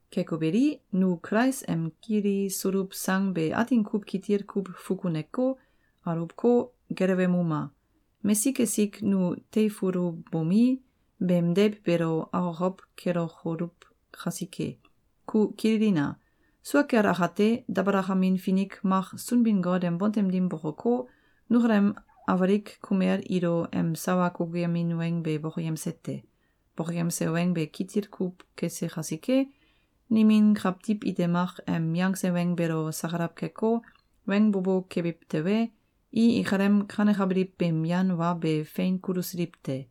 Keko beli, nu Kulais em kilisuluw sang be atin kuw kitil kuw fukuneko, aluwko, gelewemuma! Mesik esik nu teifulubomi, beem deiw beelo akokow kelokoluw kasike. Yu kililina! Sua kel akate, dabalakamin finik mak Sunbin-Got em bontem dim bokoko, nukalem awalik kumel ilo em sawa kukuyemin weng be bokoyemse te. Bokoyemse weng be kitil kuw kese kasike, nimin kawtiw ite mak em yangse weng beelo sakalaw keko, weng bo bo kebiw tewe, i ikalem kanekabiliw beem yan wa be fein kulusiliw te.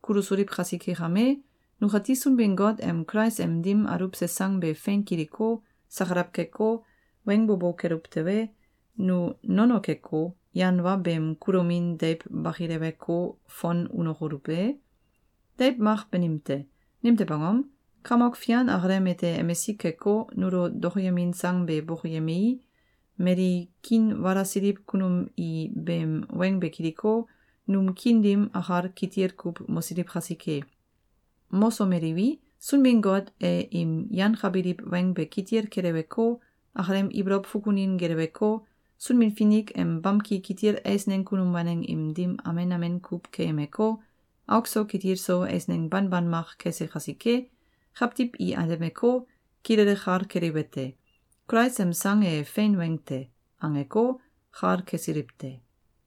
Kulusiliw kasike kame, nukati Sunbin-Got em Kulais em dim aluwse sang be fein kiliko, sakalaw keko, weng bo bo keluw tewe, nu nono keko, yan wa beem kulomin deiw bakileweko, fon unokoluw e? Deiw mak banim te. Nimtew angom? Kamok Fian akalem ete emisik keko, nulo dokoyemin sang be bokoyemei, mali kiinwalasiliw kunum i beem weng be kiliko, num kiin dim akal kitil kuw mosiliw kasike. Mosomeliwi, Sunbin-Got e im yangkabiliw weng be kitil keleweko, akalem ibolow fukunin geleweko, Sunbin-Finik em bamki kitil eisneng kunum waneng im dim amen amen kuw keyemeko, auk so kitil so eisneng banban mak kese kasike, kawtiw i atemeko, kilele kal keliwete: Kulais em sang e “Fein weng te!”, angeko, kal kesiliw te.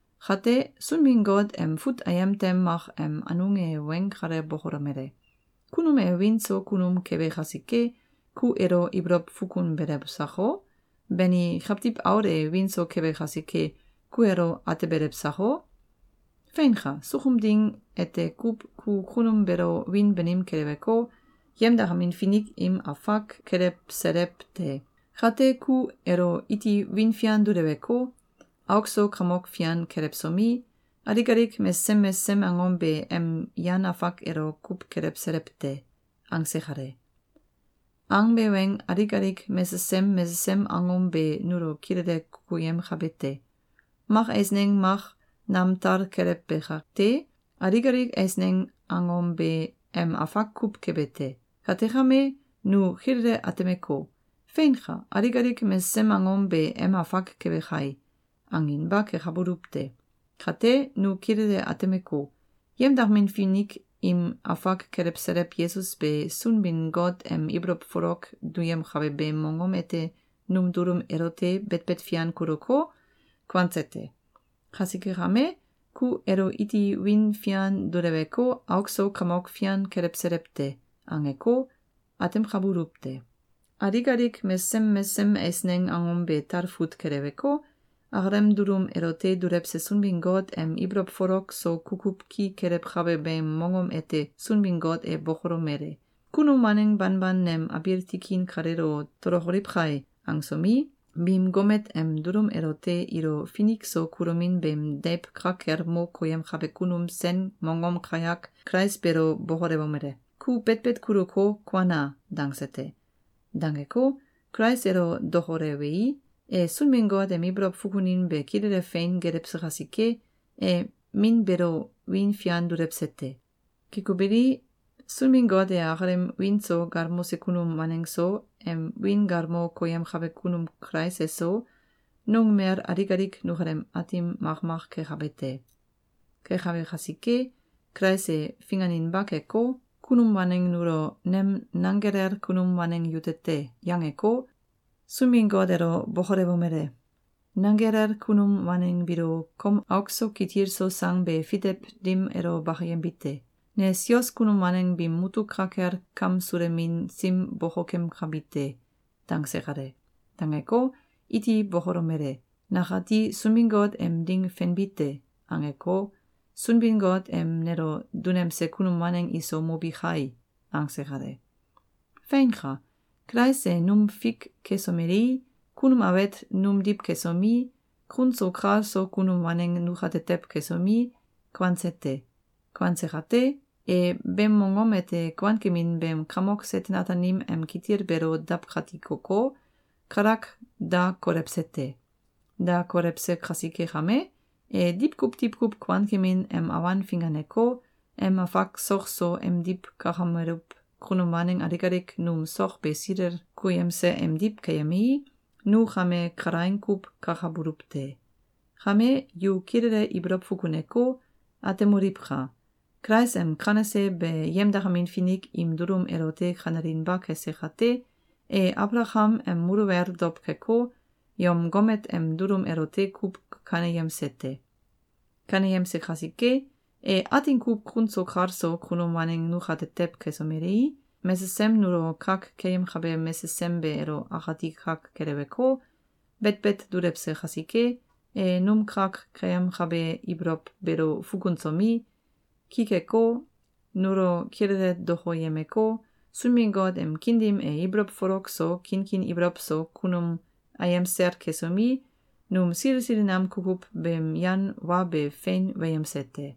Kate, Sunbin-Got em fut ayem tem mak em anung e weng kale bokolomele: “Kunum e wiin so kunum kebe kasike, ku elo ibolow fukunbelew sako? Bani, Kawtiw Aul e wiin so kebe kasike, ku elo atebelew sako? Feinka! Sukum ding ete kuw ku kunum beelo wiin banim keleweko, yemdakamin finik im afak kelewselew te. Kate, ku elo iti wiin fian duleweko, auk so kamok fian kelewsomi, alik alik mesesem mesesem angom be em yan afak elo kuw kelewselew te.”, angse kale. Angbe weng alik alik mesesem mesesem angom be nulo kilele kukuyemkabete: Mak eisneng mak nam tal kelewbe kate, alik alik eisneng angom be em afak kuw kebe te. Kate kame, nu kilele atemeko, “Feinka! Alik alik mesesem angom be em afak kebe kai!”, anginba kekabuluw te. Kate, nu kilele atemeko, “yemdakamin finik im afak kelewselew” Yesus be Sunbin-Got em ibolow folok duyemkabe beem mongom ete num dulum elote betbet fian kuluko, kuanse te. Kasike kame, “Ku elo iti wiin fian duleweko, auk so kamok fian kelewselew te.”, angeko, atemkabuluw te. Alik alik mesesem mesesem eisneng angom be talfut keleweko, akalem dulum elote dulewse Sunbin-Got em ibolow folok so kukuw ki kelewkabe beem mongom ete Sunbin-Got e bokolomele: “Kunum waneng banban nem abiil tikin kaleelo tolokoliw kai!”, angsomi, biim gomet em dulum elote ilo finik so kulomin beem deiw ka kel mo koyemkabe kunum sen mongom kayak Kulais beelo bokolewomele: “Ku betbet kuluko, kuana!”, dangse te. Dangeko, Kulais elo dokolewei, e Sunbin-Got em ibolow fukunin be kilele fein gelewse kasike, e Min beelo wiin fian dulewse te. Keko beli, Sunbin-Got e akalem wiin so galmose kunum waneng so, em wiin galmo koyemkabe kunum Kulais eso, nungmel alik alik nukalem Aatim makmak kekabe te. Kekabe kasike, Kulais e finganinba keko, kunum waneng nulo “Nem nanggelel kunum waneng yute te!”, yangeko, Sunbin-Got elo bokolewomele: “Nanggelel kunum waneng biilo kom auk so kitil so sang be fitew dim elo bakayembi te. Ne sios kunum waneng biim mutuk ka kel kamsulemin sim bokokemkabi te.”, dangse kale. Dangeko, iti bokolomele: “Nakati Sunbin-Got em ding fenbi te!”, angeko, “Sunbin-Got em nelo dunemse kunum waneng iso mobi kai!”, angse kale. Feinka! Kulais e num fik kesomelei, kunum awet numdiw kesomi, kun so kal so kunum waneng nukatetew kesomi, kuanse te. Kuanse kate, e beem mongom ete kuankemin beem kamok Seten-Ataanim em kitil beelo dawkatikoko, kalak da kolewse te. Da kolewse kasike kame, e diwkuw diwkuw kuankemin em awan finganeko, em afak sok so emdiw kakameluw kunum waneng alik alik num sok be silel koyemse emdiw keyemei, nu kame kalaing kuw kakabuluw te. Kame yu kilele ibolow fukuneko, atemoliwka! Kulais em kanese be yemdakamin finik im dulum elote kanelinba kese kate, e Abalakam em muluwel dow keko, yom gomet em dulum elote kuw kaneyemse te. Kaneyemse kasike, e atin kuw kun so kal so kunum waneng nukatetew kesomelei, mesesem nulo kak keyemkabe mesesem be elo akati kak keleweko, betbet dulewse kasike, e num kak keyemkabe ibolow beelo fukunsomi, ki keko, nulo kilele dokoyemeko, Sunbin-Got em kiin dim e ibolow folok so, kinkin ibolow so kunum ayem sel kesomi, num sili sili nam kukuw beem yan wa be fein weyemse te.